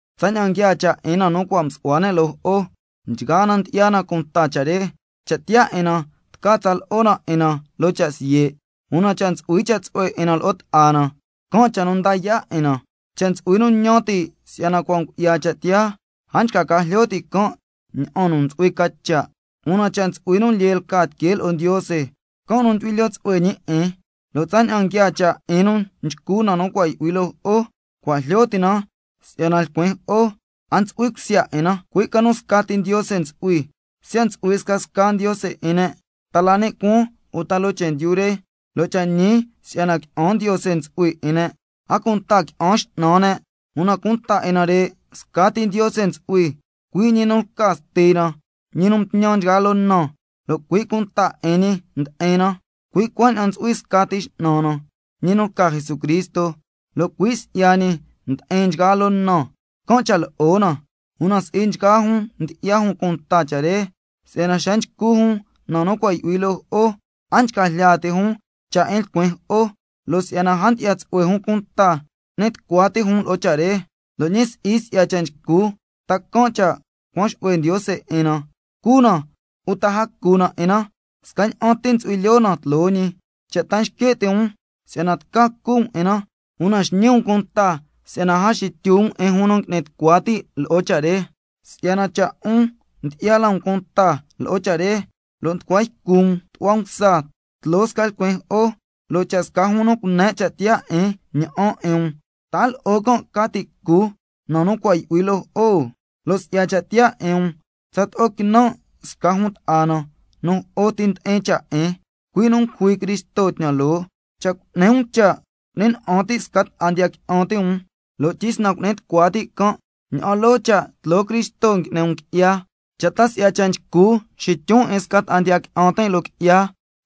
Tsaña'an nguiaa cha' 'in na nu cua' msu'hua ne' loo jo'o, nchgaa na ndyi'ya na cunta cha' re, lo' tca tsa lo'o na 'in na loo cha' siye', una cha' ntsu'hui cha' tsu'hue 'in na lo'o ta'a na, can' cha' nu nda yaa' 'in na. Cha' ntsu'hui nu ñan ti' si'yana cua' ngu'ya cha' tiyaa, a nchca ca jlyo ti' ña'an nu ntsu'hui ca cha'. Una cha' ntsu'hui nu lyee lca tiquee lo'o Ndiose, can' nu ndyu'hui lyoo tsu'hue ñi 'in. Lo' tsaña'an nguiaa cha' 'in nu nchcu na nu cua' yu'hui loo jo'o, cua' jlyo ti' na si'yana lcuin jo'o a ntsu'hui cusya 'in na, cui' ca nu scati Ndiose ntsu'hui. Siya' ntsu'hui scasca ndiose 'in ne', ta la ni' cuaan uta loo chendyu re, (lo' cha' ñi si'yana qui'an ndiose ntsu'hui 'in ne', a cunta qui'an x'nan ne'), una cunta 'in nare', scati Ndiose ntsu'hui, cui' ñi nu lca Stina, ñi nu mtñan nchgaa loo na, lo' cui' cunta 'in ñi ndi'in na. Cui' cuaña'an ntsu'hui scati X'nan na, ñi nu lca Jesucristo, lo' cui' si'ya ñi ndi'in nchgaa loo na, can' cha' lo'o na. Una si'i nchgaa jun ndyi'ya jun cunta cha' re, si'yana xa nchcu jun na nu cua' yu'hui loo jo'o, a nchca jlya ti' jun cha' 'in lcuin jo'o, lo' si'yana a ndyi'ya tsu'hue jun cunta, n'ni tucua ti' jun lo'o cha' re. Lo' ñi si'i si'ya cha' nchcu, ta can' cha' cuan xu'hue Ndiose 'in na. Cu na, uta a cu na 'in na, scaña'an ti ntsu'hui lyoo na tloo ñi. Cha' ta xque' ti' um si'yana tca cu um 'in na, una xñi um cunta si'yana a xitlyu um 'in jun nu ngui'ni tucua ti' lo'o cha' re. Si'yana cha' 'un ndyi'ya la um cunta lo'o cha' re, lo' nducua ycu um tu'hua msa tloo sca lcuin jo'o, lo' cha' sca jun nu cune' cha' tiyaa 'in ña'an 'in um, ¿ta a lo'o can' ca ti' cu na nu cua' yu'hui loo jo'o? Lo' si'ya cha' tiyaa 'in um tsato'o quinan' sca jun ta'a na nu jo'o ti ndi'in cha' 'in, cui' nu ngujui Cristo tñan loo. Cha' cuaña'an cu'ni um cha' cu'ni na'an ti' sca ta'a ndiya qui'an ti' um, lo' tyisnan cu'ni tucua ti' can', ña'an loo cha' tloo Cristo ngui'ni um qui'ya. Cha' ta si'ya cha' nchcu xityun 'in sca ta'a ndiya qui'an tin' loo qui'ya,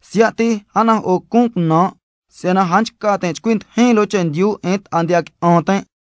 siya' ti a najo'o cun cunan', si'yana a nchca tin' chcui ndijin loo chendyu 'in sca ta'a ndiya qui'an tin'.